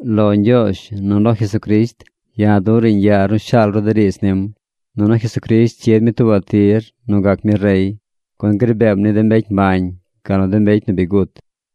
Lo Ñgyoozh nu lo Jesucrisht, ya̱ duꞌ riiñ yaar nu shaal ru de riidz nim. Nunu Jesucrisht cyid mi tuubaꞌ tir nu gac mi rey, gun gri beem ni de mbecy mbañ gal nu de mbecy nu bi gut.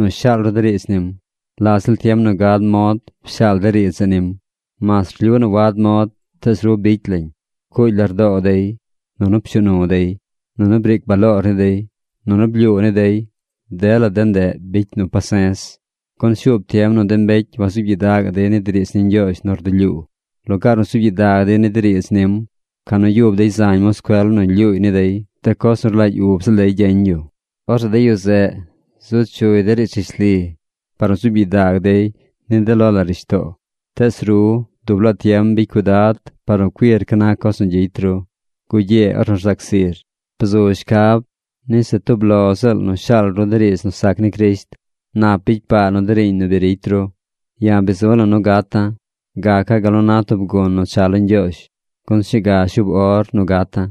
shaal ru de riidz nim. La ziꞌl tiem nu gad mod pshaal de riidz zeꞌ nim. Mas rlyu nu wad mod, tees ru bicy lañ. Pcuugy lardoo dey. Nunu pshuu nu dey. Nunu briic baloor ni dey. Nuu blyuu ni dey. Dela de ndeꞌ bicy nu pase̱z. Gun shuub tiem nu de mbecy wazuub gyidagaꞌ dey ni de riidz ni Ñgyoozh nu rdulyuu. Lugaar nu zuub gyidag dey ni de riidz nim, ca nu yub dey zañ moscuel nu lyuuy ni dey de coz nu rlagy ub ziꞌl dey gyeñ yu. Orzeꞌ de yu zeꞌ zu chuy de riidz rishli par nu gzuub gyidag dey ni de lo la rishtoo. Tees ru dub laa tiem bicy cuidad par nu cuir ca na coz nu gyicy ru. Gugyee ornu rzac zir. Bzu shcab ni se tub lo ziꞌl nu shaal ru de riidz nu sac ni Crisht. Nap bicy paa nu de riiñ nu bi ricy ru. Ya̱ bi zu̱ la̱ nu gata̱. Gaca̱ gal nu na tub gun nu cha lo Ñgyoozh, gun sñuu ga shuub or nu gata̱.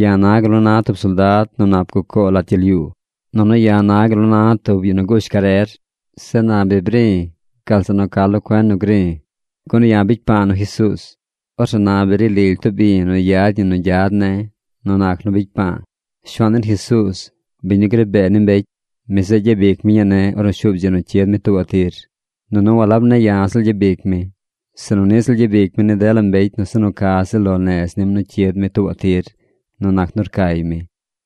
Ya̱ na gal nu na tub soldad nu nap gucoo lat gyel yuu. Nunu ya̱ na gal nu na tub yu nu gush carer. Zeꞌ na bi bri̱ gal zeꞌ nu ca lo cuen nu gri̱. Gun ya̱ bicy pa̱a̱ nu Jesuuz. Orzeꞌ na bi ri lily tub i̱ nu yad ñi nu gyad ne̱ nu nac nu bicy pa̱a̱. Shuaan den Jesuuz, biñ nu gri bee ni mbecy, mi zeꞌ gyabic mi ñii ne̱ ornu shuub dzi nu cyid mi tuubaꞌ tir. Nunu walab ne̱ ya̱ ziꞌl gyabic mi, sinu niꞌ ziꞌl gyabic mi ni dela mbecy nu se nu ca ziꞌl lo nez nim nu cyid mi tuubaꞌ tir nu nac nu rcay mi.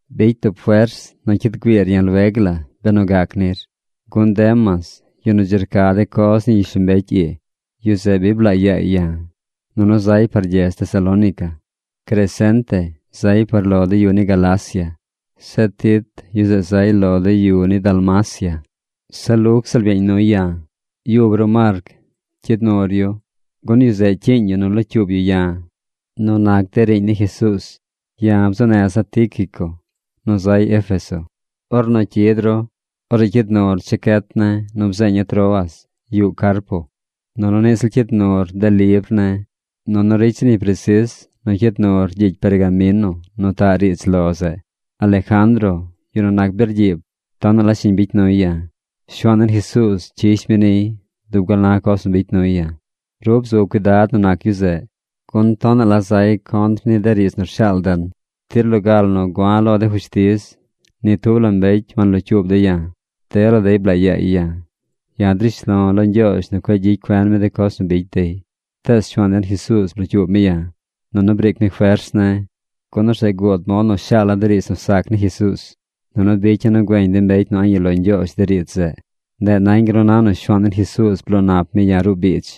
Bicy tub fers nu cyid güiir ya̱ lueg la benu gac nir. Gun Demas, yu nu dzi rca de coz nu yuꞌ gyishlombecy ii, yu zeꞌ bi blaa yaay ya̱, nunu zay par gyedz Tesalónica. Crescente zay par lo de yu ni Galacia. Zeꞌ Tit, yu zeꞌ zay lo de yu ni Dalmacia. Se Luc ziꞌl byeeñ nuy ya̱. Yub ru Marc cyid nur yu, gun yu zeꞌ cyiiñ yu nu locyuub yu ya̱ nu nac de riiñ ni Jesuuz. Ya̱ bzuu neza̱ Tíquico nu zay Éfeso. Ornu cyid ru, orzeꞌ cyid nur chacyet ne̱ nu bzeeña̱ Troas yuꞌ Carpo. Nunu niꞌ ziꞌl cyid nur de libr ne̱. Nunu ricy zir ñi presis nu cyid nur gyicy pergamino nu taꞌ riidz lo zeꞌ. Alejandro, yu nu nac birgyiib, tonaꞌ la shiñ bicy nuy ya̱. Shuaan den Jesuuz cyish mi niy dub gal na coz nu bicy nuy ya̱. Ru bzu cuidad nu nac yu zeꞌ, gun tonaꞌ la zay contr ni de riidz nu rshaal den. Tir loga la nu gua̱ lo de fushtiz, ni tub la mbecy wanlocyuub dey ya̱. Dela dey blaa yaay ya̱. Ya̱ drish lo̱ lo Ñgyoozh nu cueꞌ gyicy cuen mi de coz nu bicy dey. Tees Shuaan den Jesuuz blocyuub mi ya̱, nunu briic mi fers ne̱, gun orzeꞌ guud mod nu shaala̱ de riidz nu sac ni Jesuuz, nunu bicya̱ nu güeñ de mbecy nu a̱ꞌ yuꞌ lo Ñgyoozh de riidz zeꞌ. Ndeꞌ nañ gal nu na nu Shuaan den Jesuuz bloo nap mi ya̱ ruꞌ biidz.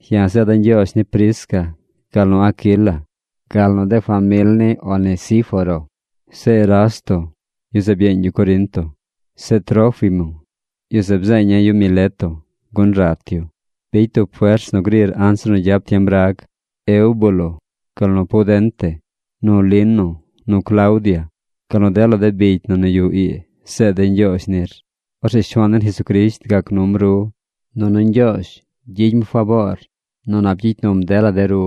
Ya̱ zeeda̱ ñgyoozh ni Prisca gal nu ni Aquila, gal nu de famil ni Onesíforo. Zeꞌ Erasto, yu zeꞌ byeeñ yu Corinto. Zeꞌ Trófimo, yu zeꞌ bzeeña̱ yu Mileto, gun rat yu. Bicy tub fers nu grir anzir nu gyap tiem rag. Eubulo, gal nu Pudente, nu Lino, nu Claudia, gal nu dela de bicy na nu yuꞌ ii zeed dey ñgyoozh nir. Orzeꞌ Shuaan den Jesucrisht gac num ru. Nunu Ñgyoozh gyicy mi faboor nu nap gyicy num dela der.